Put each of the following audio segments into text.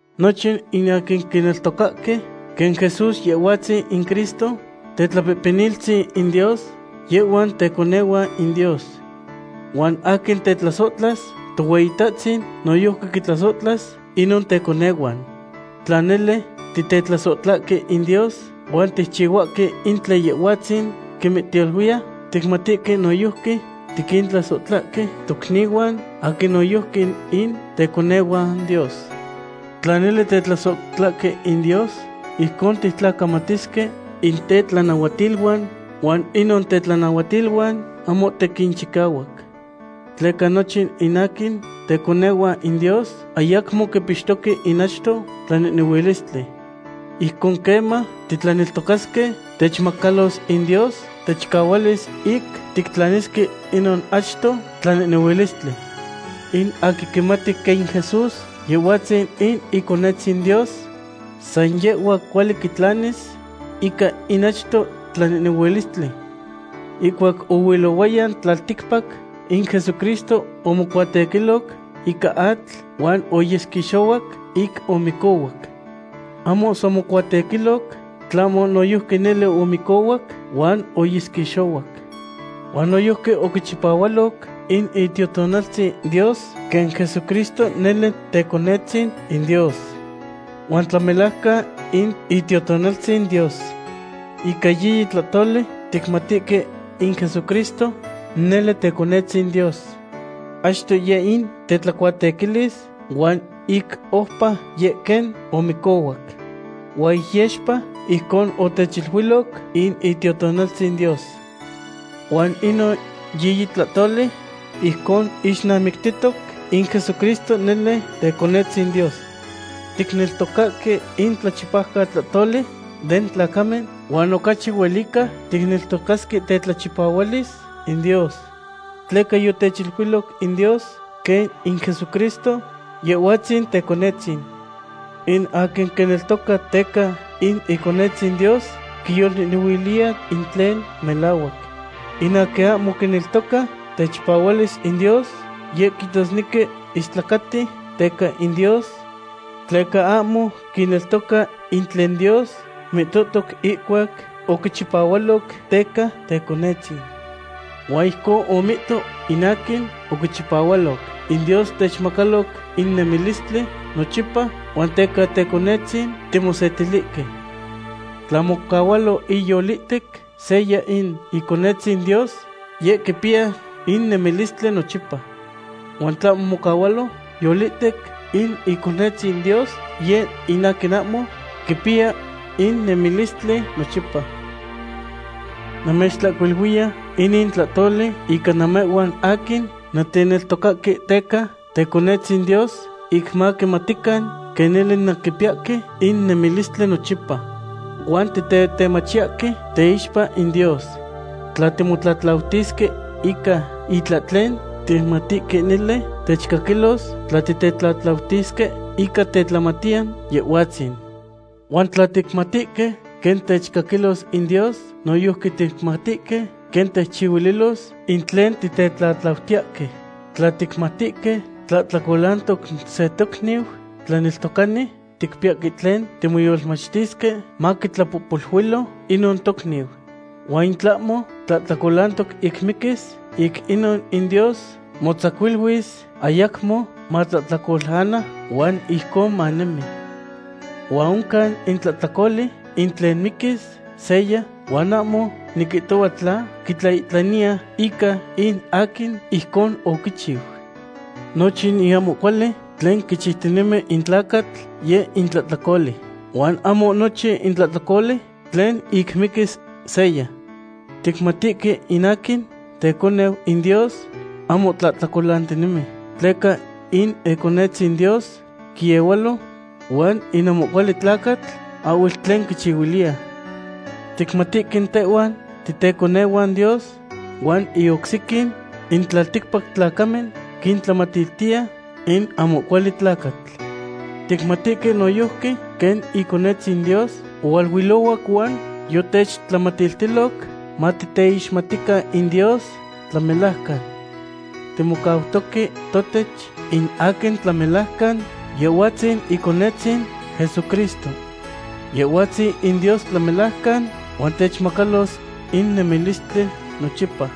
Nochin in aquin quineltocahque quen Jesús Yehhuatzin in Cristo Tetlapehpeniltzin in Dios, yehhuan teconehuan in Dios. Huan aquin tetlasohtlas Tohueyitahtzin noyojqui quintlasohtlas inon teconehuan. Tla nele titetlasohtlahque in Dios huan ticchihuahque in tlen Yehhuatzin quimihtaluiya, ticmatihque noyojqui tiquintlasohtlahque tocnihuan aquin noyojqui in teconehuan Dios. Tla nele titetlasohtlahque in Dios, ijcon tictlacamatisque in tetlanahuatiluan, huan inon tetlanahuatiluan ahmo tequin chicahuac. Tleca nochin in aquin teconehuan in Dios ayacmo quipixtoque in achto tlanehnehuilistli. Ijcon queman titlaneltocasque, techmacalos in Dios techicahualis ic tictlanisque inon achto tlanehnehuilistli. In aquin quimati quen in Jesús Yehhuatzin in Iconetzin Dios, san yehhua cuali quitlanis ica in achto tlanehnehuilistli. Ihcuac oilohuaya tlalticpac, in Jesucristo omocuatequiloc ica atl huan oyesquixohuac ic omicohuac. Ahmo san omocuatequiloc, tlahmo noyojqui nele omicohuac, huan oyesquixohuac. Huan noyojqui oquichipahualoc in Itiotonaltzin Dios quen Jesucristo nele Teconetzin in Dios. Huan tlamelajcan in Itiotonaltzin Dios. Ica yiyi tlahtoli ticmatihque in Jesucristo nele Teconetzin Dios. Achto yeh in tetlacuatequilis huan ic oupa yeh quen omicohuac. Huan ic yexpa ijcon otechiluiloc in Itiotonaltzin Dios. Huan inon yiyi tlahtoli ijcon ixnamictihtoc in Jesucristo nele Teconetzin Dios. Ticneltocahque in tlachipaucatlahtoli den tlacamen, huan ocachi huelica ticneltocasque tetlachipahualis in Dios. Tleca yotechiluiloc in Dios quen in Jesucristo, Yehhuatzin Teconetzin. In aquin quineltoca teca in Iconetzin Dios quiyolnehnehuiliya in tlen melahuac. In aquin ahmo quineltoca techipahualis in Dios, yeh quihtosnequi istlacati teca in Dios, tleca ahmo quineltoca in tlen Dios mihtohtoc ihcuac oquichipahualoc teca Teconetzin. Huan ijcon omihto in aquin oquichipahualoc. In Dios techmacalotoc in nemilistli nochipa, huan teca Teconetzin timosetilihque. Tla mocahualo iyolihtec seya in Iconetzin Dios, yeh quipiya in nemilistli nochipa. Huan in tlahmo mocahualo yolihtec in Iconetzin Dios yeh in aquin ahmo quipiya in nemilistli nochipa. Namechihcuiluiya inin tlahtoli ica namehhuan aquin nanteneltocahque teca Teconetzin Dios, ic maquimatican quen nele nanquipiyahque in nemilistli nochipa. Huan titetemachiyahque teixpa in Dios. Tla timotlatlautisque ica itlahtlen, ticmatihque nele techcaquilos tla titetlatlautisque ica tetlamatiyan Yehhuatzin. Huan tla ticmatihque quen techcaquilos in Dios, noyojqui ticmatihque quen techchihuililos in tlen titetlatlautiyahque. Tla ticmatihque tlahtlacolantoc se tocniu tlaneltocani, ticpiyahque tlen timoyolmachtisque maquitlapohpoluilo inon tocniu. Huan in tlahmo tlahtlacolantoc ic miquis, ic inon in Dios motzacuiluilis ayacmo matlahtlacolana huan ijcon manemi. Huan oncan in tlahtlacoli ic tlen miquis seya, huan ahmo niquihtohua tla quitlaihtlaniya ica in aquin ijcon oquichiu. Nochin ahmo cuali tlen quichiutinemi in tlacatl, yeh in tlahtlacoli, huan ahmo nochin tlahtlacoli tlen ic miquis seya. Ticmatihque in aquin teconeu in Dios ahmo tlahtlacolantinemi, tleca in Iconetzin Dios quiehualo huan in ahmo cuali tlacatl ahhuel tlen quichihuiliya. Ticmatihque tehhuan titeconehuan Dios, huan in oc sequin in tlalticpac tlacamen quintlacamatiltiya in ahmo cuali tlacatl. Ticmatihque noyojqui quen Iconetzin Dios ohualuilohuac huan yotechtlamatiltiloc matiteixmatican in Dios tlamelajcan. Timocautoque totech in aquin tlamelajcan Yehhuatzin Iconetzin Jesucristo. Yehhuatzin in Dios tlamelajcan, huan techmacalos in nemilistli nochipa.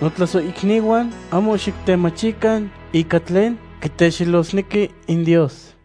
Notlasohicnihuan, ahmo xictemachican ica tlen quitexelosnequi in Dios.